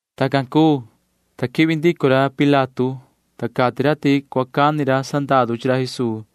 Tacan cuu, ta quihvi ndico ra Pilato, ta cati ra ti cua cani ra sandaru chi ra Jesuu.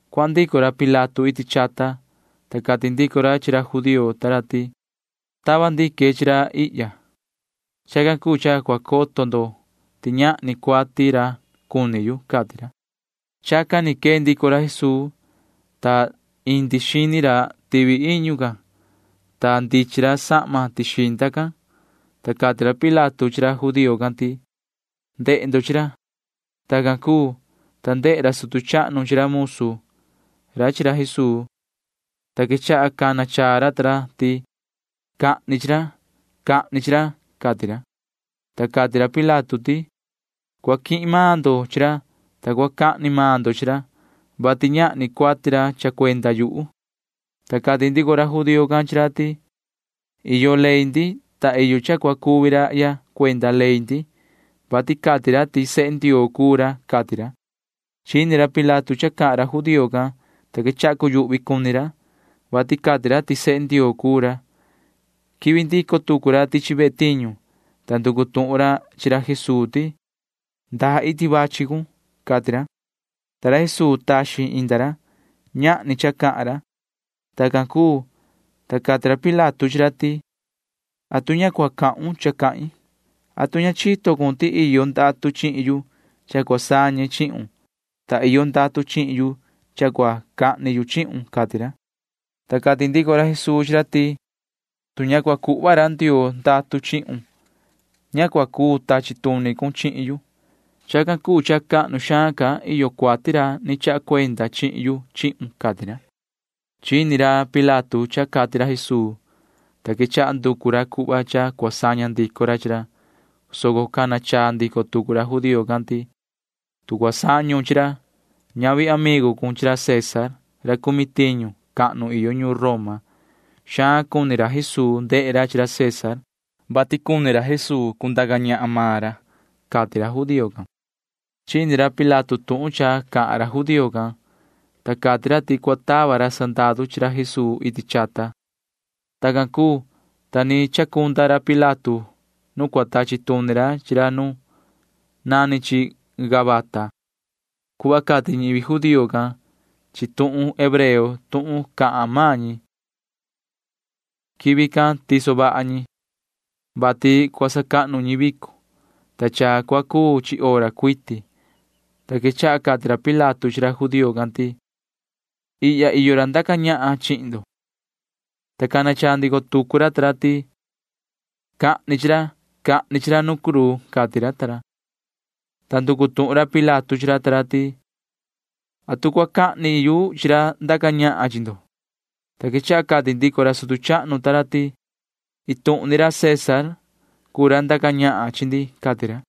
Cuahan ndico ra Pilato iti chata, ta cati ndico ra chi ra judío ta ra ti: ―Tava ndique chi ra ihya. Chacan cuu cha cua coto ndo ti ñahni cuati ra cuni yu ―cati ra. Chacan ni quee ndico ra Jesuu, ta indi xini ra tivi iñu can, ta ndichin ra sahma tixinda can, ta cati ra Pilato chi ra judío can ti: ―Na ndehe ndo chi ra. Tacan cuu, ta ndehe ra sutu chahnu chi ra musu ra chi ra Jesuu, ta quechaha cana chaa ra ta ra ti: ―Cahni chi ra. Cahni chi ra ―cati ra. Ta cati ra Pilato ti: ―Cua quihin maan ndo chi ra, ta cua cahni maan ndo chi ra, vati ñahni cuati ra cuni yu. Ta cati ndico ra judío can chi ra ti: ―Iyo ley ndi, ta iyo cha cua cuvi rahya cuenda ley ndi, vati cati ra ti sehe Ndioo cuu ra ―cati ra. Chini ra Pilato cha cahan ra judío can, ta quechaha cuyuhvi cuni ra, [vati cati ra ti sehe Ndioo cuu ra]. Quihvi ndico tucu ra tichi ve tiñu, ta nducu tuhun ra chi ra Jesuu ti: ―¿Ndaa iti quichi cun? ―cati ra. Ta ra Jesuu taxin inda ra. Ñahni cha cahan ra. Tacan cuu, ta cati ra Pilato chi ra ti: ―¿Atu ña cua cahun cha cahin? ¿Atu ña chito cun ti iyo ndatu chihin yu cha cua sañe chihun, ta iyo ndatu chihin yu cha cua cahni yu chihun? ―cati ra. Ta cati ndico ra Jesuu chi ra ti: ―Tu ña cua cuhva ra Ndioo ndatu chihun, ña cua cuu tachi tuni cun chihin yu. Chacan cuu cha cahnu xaan ca iyo cuati ra ni chaha cuenda chihin yu chihun ―cati ra. Chini ra Pilato cha cati ra Jesuu, ta quechaha nducu ra cuhva cha cua saña ndico ra chi ra, soco cana chaa ndico tucu ra judío can ti: ―Tu cua sañon chi ra, ñavi amigu cun chi ra César ra cumi tiñu cahnu iyo ñuun Roma. Xaan cuni ra Jesuu ya chi ra César, vati cuni ra Jesuu cundaca ñahan maan ra ―cati ra judío can. Chini ra Pilato tuhun cha cahan ra judío can, ta cati ra ti cua tava ra sandaru chi ra Jesuu iti chata. Tacan cuu, ta ni chacunda ra Pilato nu cua tachi tuni ra chi ra nu nani chi Gabata cuhva cati ñivi judío can chi tuhun hebreo tuhun cahan maan ñi. Quivi can tiso vaha ñi, vati cua sacahnu ñi vico, ta cha cua cuu chi hora cuiti, ta quechaha cati ra Pilato chi ra judío can ti: ―¡Jihna! Ihya cha iyo ra ndaca ñahan chihin ndo. Ta cana chaa ndico tucu ra ta ra ti: ―Cahni chi ra. Cahni chi ra nu cruu ―cati ra. Ta nducu tuhun ra Pilato chi ra ta ra ti: ―¿Atu cua cahni yu chi ra ndaca ñahan chi ndo? Ta quechaha cati ndico ra sutu chahnu ta ra ti: ―Iin tuhun ni ra César cuu ra ndaca ñahan chi ndi ―cati ra.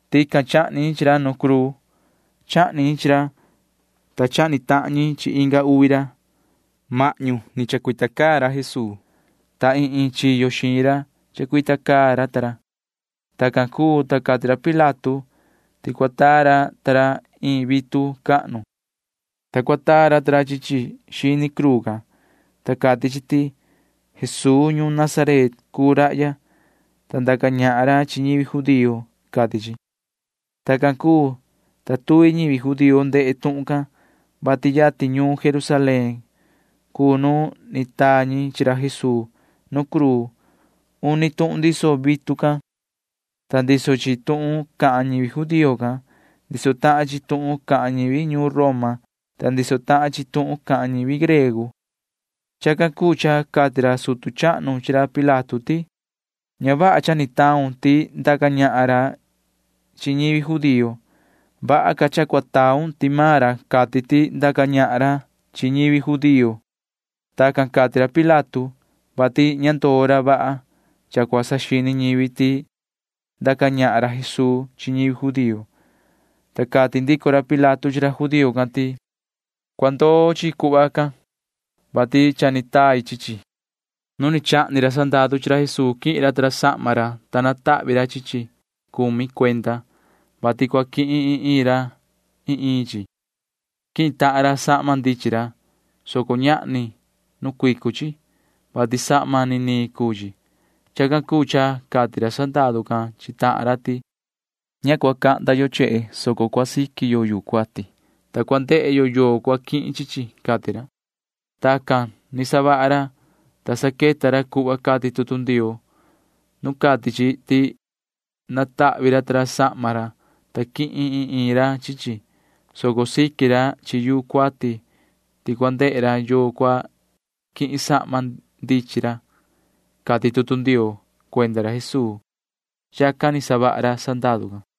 Tican chahni ñi chi ra. Nu cruu chahni ñi chi ra, ta chahni tahan ñi chi inga uvi ra. Mahñu ni chacuita caa ra Jesuu, ta iin iin chiyo xiin ra chacuita caa ra ta ra. Tacan cuu, ta cati ra Pilato ti cua taa ra ta ra iin vitu cahnu, ta cua taa ra ta ra chi chi xini cruu can, ta cati chi ti: “Jesuu ñuun Nazaret cuu rahya, ta ndaca ñahan ra chi ñivi judío,” cati chi. Tacan cuu, ta tuvi ñivi judío ndehe tuhun can, vati yatin ñuun Jerusalén cuu nu ni taa ñi chi ra Jesuu nu cruu. Uni tuhun ndiso vitu can, ta ndiso chi tuhun cahan ñivi judío can. Ndiso tahan chi tuhun cahan ñivi ñuun Roma, ta ndiso tahan chi tuhun cahan ñivi griego. Chacan cuu cha cati ra sutu chahnu chi ra Pilato ti: ―Ña vaha cha ni taun ti ndaca ñahan ra chi ñivi judío. Vaha ca cha cua taun ti maan ra cati ti ndaca ñahan ra chi ñivi judío. Tacan cati ra chi ra Pilato, [vati ña ndoo ra vaha cha cua saxini ñivi ti ndaca ñahan ra Jesuu chi ñivi judío]. Ta cati ndico ra Pilato chi ra judío can ti: ―Cua ndoo chi cuhva can, vati cha ni tai chi chi. Nu ni chahni ra sandaru chi ra Jesuu quihin ra ta ra sahma cuati ra, ta cumi cuenda chi natahvi ra chi chi, vati cua quihin iin iin ra iin iin chi. Quihin tahan ra sahma ndichin ra, soco ñahni nu cuicu chi, vati ini sahma niniin cuu chi. Chacan cuu cha cati ra sandaru can chi tahan ra ti: ―Ña cua cahnda yo chehe, soco cua siqui yo yuu cuati, ta cua ndehe yo yoo cua quihin chi chi ―cati ra. Tacan ni savaha ra, ta saqueta ra cuhva cati tutu Ndioo nu cati chi ti natahvi ra ta ra sahma ra, ta quihin iin iin ra chi chi, soco siqui ra chi yuu cuati ti cua ndehe ra yoo cua quihin sahma ndichin ra, cati tutu Ndioo cuenda ra Jesuu. Chacan ni savaha ra sandaru can.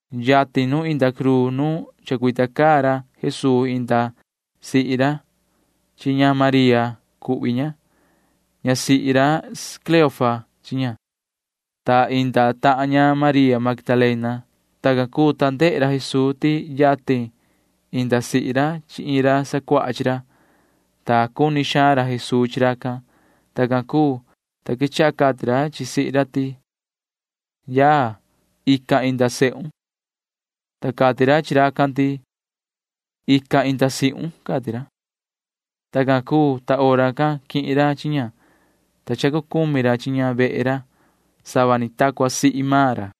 Yatin nu inda cruu nu chacuita caa ra Jesuu inda sihi ra chi ña María cuhvi ña. Ñasihi ra Cleofa chi ña, ta inda tahan ña María Magdalena. Tacan cuu, ta ndehe ra Jesuu ti yatin inda sihi ra chi iin ra sacuaha chi ra, ta cuni xaan ra Jesuu chi racan. Tacan cuu, ta quechaha cati ra chi sihi ra ti: ―Yaya, ican inda sehun. Ta cati ra chi racan ti: ―Ican inda sihun ―cati ra. Tacan cuu, ta hora can quihin ra chi ña, ta cha cucumi ra chi ña vehe ra [sava ni ta cua sihi maan ra].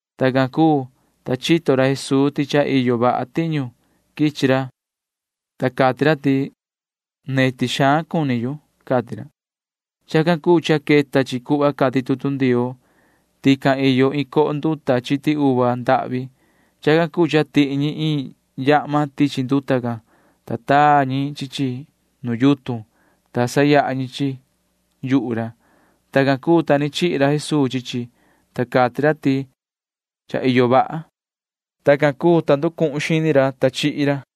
Tacan cuu, ta chito ra Jesuu ti cha iyo vaha tiñu quichi ra, ta cati ra ti: ―Neti xaan cuni yu ―cati ra. Chacan cuu cha queta chi cuhva cati tutu Ndioo. Tican iyo iin coho nduta chiti uva ndahvi. Chacan cuu cha tihi ñi iin yahma tichi nduta can, ta taa ñi chi chi nu yutun, ta sayaha ñi chi chi yuhu ra. Tacan cuu, ta ni chihi ra Jesuu chi chi, ta cati ra ti: ―Cha iyo vaha. Tacan cuu, ta ni nducuhun xini ra, ta ni chihi ra.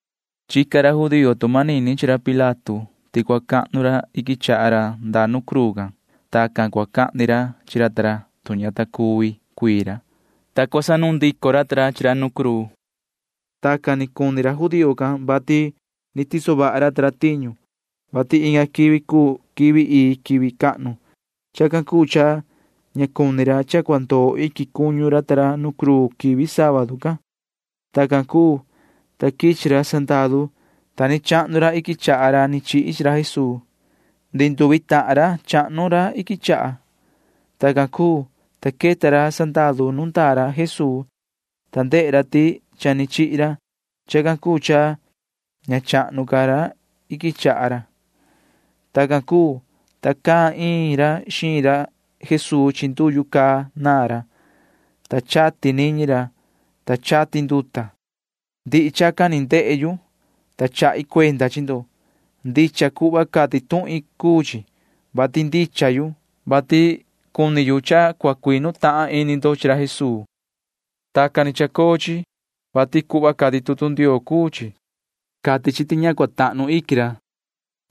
Chica ra judío tu manini chi ra Pilato ti cua cahnu ra iquin chaha ra ndaa nu cruu can. Tacan cua cahni ra chi ra ta ra, tu ña ta cuvi cuii ra, ta cua sanuun ndico ra ta ra chi ra nu cruu. Tacan ni cuni ra judío can, vati ni tiso vaha ra ta ra tiñu, vati inga quivi cuu quivi ii quivi cahnu. Chacan cuu cha ña cuni ra cha cua ndoo iquin cuñu ra ta ra nu cruu quivi sábadu can. Tacan cuu, ta quichi ra sandaru, ta ni chahnu ra iquin chaha ra ni chihi chi ra Jesuu. Ndihi nduvi tahan ra chahnu ra iquin chaha ra. Tacan cuu, ta queta ra sandaru nu ndaa ra Jesuu, ta ndehe ra ti cha ni chihi ra. Chacan cuu cha ña chahnu ca ra iquin chaha ra. Tacan cuu, ta caan iin ra xiin ra Jesuu chi nduyu ra, ta chati niñi ra, ta chati nduta. Ndihi chacan ni ndehe yu, ta chahi cuenda chi ndo. Ndicha cuhva cati tuhin cuu chi, vati ndicha yu, vati cuni yu cha cua cuinu tahan ini ndo chi ra Jesuu. Tacan ni chacoo chi, vati cuhva cati tutu Ndioo cuu chi. Cati chi ti ña cua tahnu iquin ra,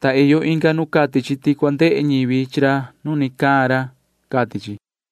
ta iyo inga nu cati chi ti cua ndehe ñivi chi ra nu ni caan ra, cati chi.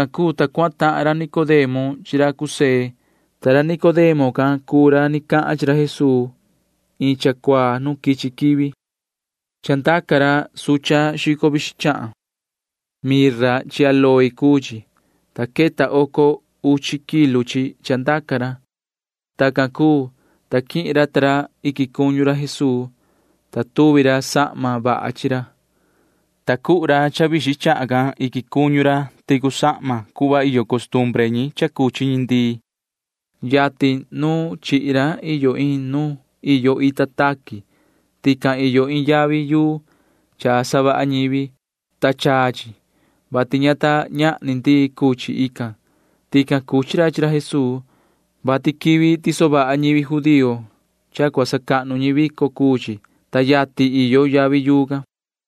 Tacan cuu, ta cuahan tahan ra Nicodemo chi ra José, ta ra Nicodemo can cuu ra ni cahan chi ra Jesuu iin cha cuaa nu quichi quivi. Chandaca ra xahan chahan xico vixin. Mirra chi áloe cuu chi, ta queta oco uchi kilu chi chandaca ra. Tacan cuu, ta quihin ra ta ra iquin cuñu ra Jesuu, ta tuvi ra sahma vaha chi ra, ta cuhu ra xahan can iquin cuñu ra ticu sahma can cuhva iyo costumbre ñi cha cuchi ñi ndii. Yatin nu chihi ra iyo iin nu iyo ita taqui. Tican iyo iin yavi yuu cha savaha ñivi, ta chaa chi, vati ña ta ñahni ndii cucuchi ican. Tican cuchi ra chi ra Jesuu, vati quivi tiso vaha ñivi judío cha cua sacahnu ñi vico cuu chi, ta yatin iyo yavi yuu can.